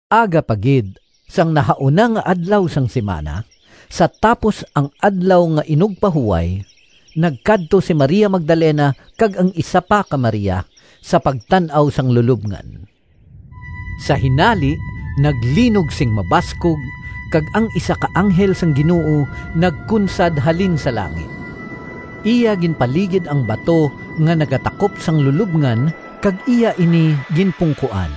Aga pa gid sang nahauna nga adlaw sang simana, sa tapos ang Adlaw nga Inugpahuway, nagkadto si Maria Magdalena kag ang isa pa ka Maria sa pagtan-aw sang lulobngan. Sa hinali naglinog sing mabaskog, kag ang isa ka anghel sang Ginoo nagkunsad halin sa langit. Iya ginpaligid ang bato nga nagatakop sa lulobngan kag iya ini ginpungkoan.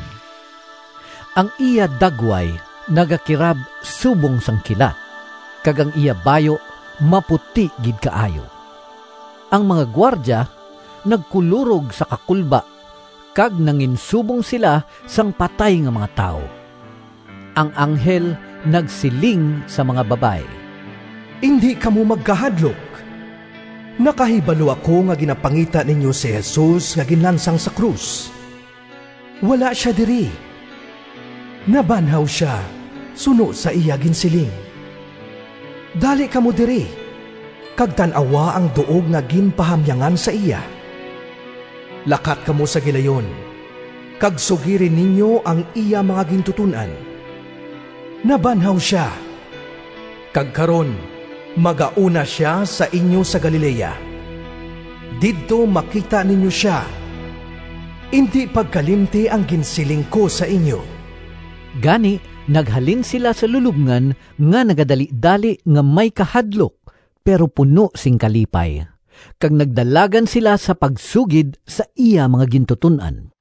Ang iya dagway nagakirab subong sang kilat, kag ang iya bayu maputi gid kaayo. Ang mga gwardya nagkulorog sa kakulba kag nanginsubong sila sang patay nga mga tawo. Ang anghel nagsiling sa mga babayi, “Indi kamo magkahadlok. Nakahibalo ako nga ginapangita ninyo si Jesus nga ginlansang sa krus. Wala sia diri. Nabanhaw sia, suno sa iya ginsiling. Dali kamo diri kag tan-awa ang duog nga ginpahamyangan sa iya. Lakat kamo sa gilayon, kag sugiri ninyo ang iya mga gintuton-an: ‘Nabanhaw sia, kag karon magauna sia sa inyo sa Galilea. Didto makita ninyo sia!’ Indi pagkalimti ang ginsiling ko sa inyo.” Gani naghalin sila sa lulobngan nga nagadalidali nga may kahadlok, pero puno sing kalipay, kag nagdalagan sila sa pagsugid sa iya mga gintuton-an.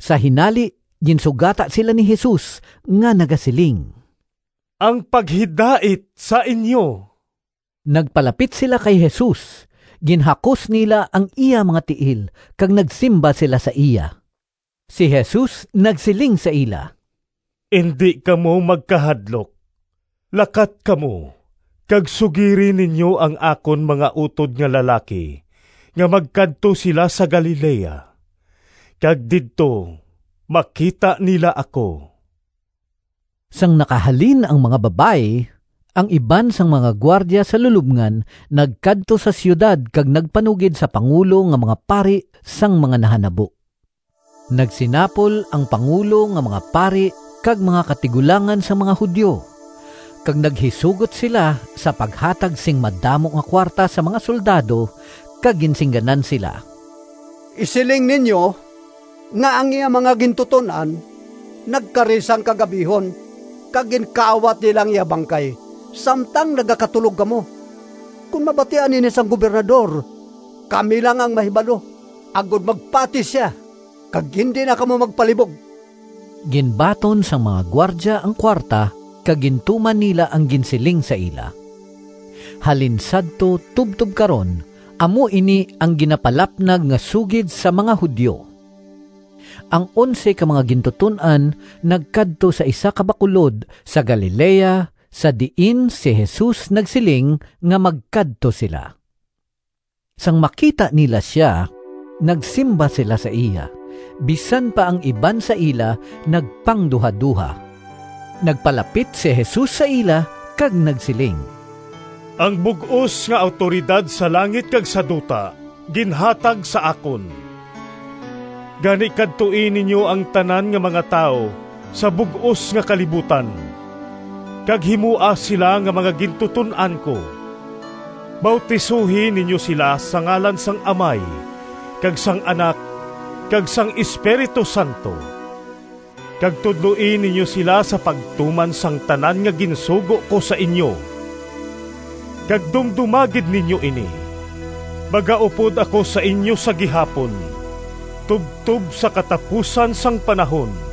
Sa hinali ginsugata sila ni Jesus nga nagasiling, “Ang paghidait sa inyo.” Nagpalapit sila kay Jesus, ginhakos nila ang iya mga tiil kag nagsimba sila sa iya. Si Jesus nagsiling sa ila, “Indi kamo magkahadlok. Lakat kamo kag sugiri ninyo ang akon mga utod nga lalaki nga magkadto sila sa Galilea, kag didto makita nila ako.” Sang nakahalin ang mga babayi, ang iban sang mga gwardya sa lulobngan nagkadto sa siyudad kag nagpanugid sa pangulo nga mga pari sang mga nahanabo. Nagsinapol ang pangulo nga mga pari kag mga katigulangan sang mga Judio, kag naghisugot sila sa paghatag sing madamo nga kuwarta sa mga soldado, kag ginsingganan sila, “Isiling ninyo nga ang iya mga gintuton-an nagkari sang kagab-ihon kag ginkawat nila ang iya bangkay samtang nagakatulog kamo. Kon mabatian ini sang Gobernador, kami lang ang mahibalo agod magpati sia kag indi na kamo magpalibog.” Ginbaton sang mga gwardya ang kuwarta kag gintuman nila ang ginsiling sa ila. Halin sadto tubtob karon amo ini ang ginapalapnag nga sugid sa mga Judio. Ang onse ka mga gintuton-an nagkadto sa isa ka bakulod sa Galilea, sa diin si Jesus nagsiling nga magkadto sila. Sang makita nila sia, nagsimba sila sa iya, bisan pa ang iban sa ila nagpangduhadoha. Nagpalapit si Jesus sa ila kag nagsiling, “Ang bug-os nga awtoridad sa langit kag sa duta ginhatag sa akon. Gani, kadtoi ninyo ang tanan nga mga tawo sa bug-os nga kalibutan kag himoa sila nga mga gintuton-an ko. Bautisohi ninyo sila sa ngalan sang Amay kag sang Anak kag sang Espiritu Santo, kag tudloi ninyo sila sa pagtuman sang tanan nga ginsugo ko sa inyo. Kag dumdoma gid ninyo ini! Magaupod ako sa inyo sa gihapon tubtob sa katapusan sang panahon.”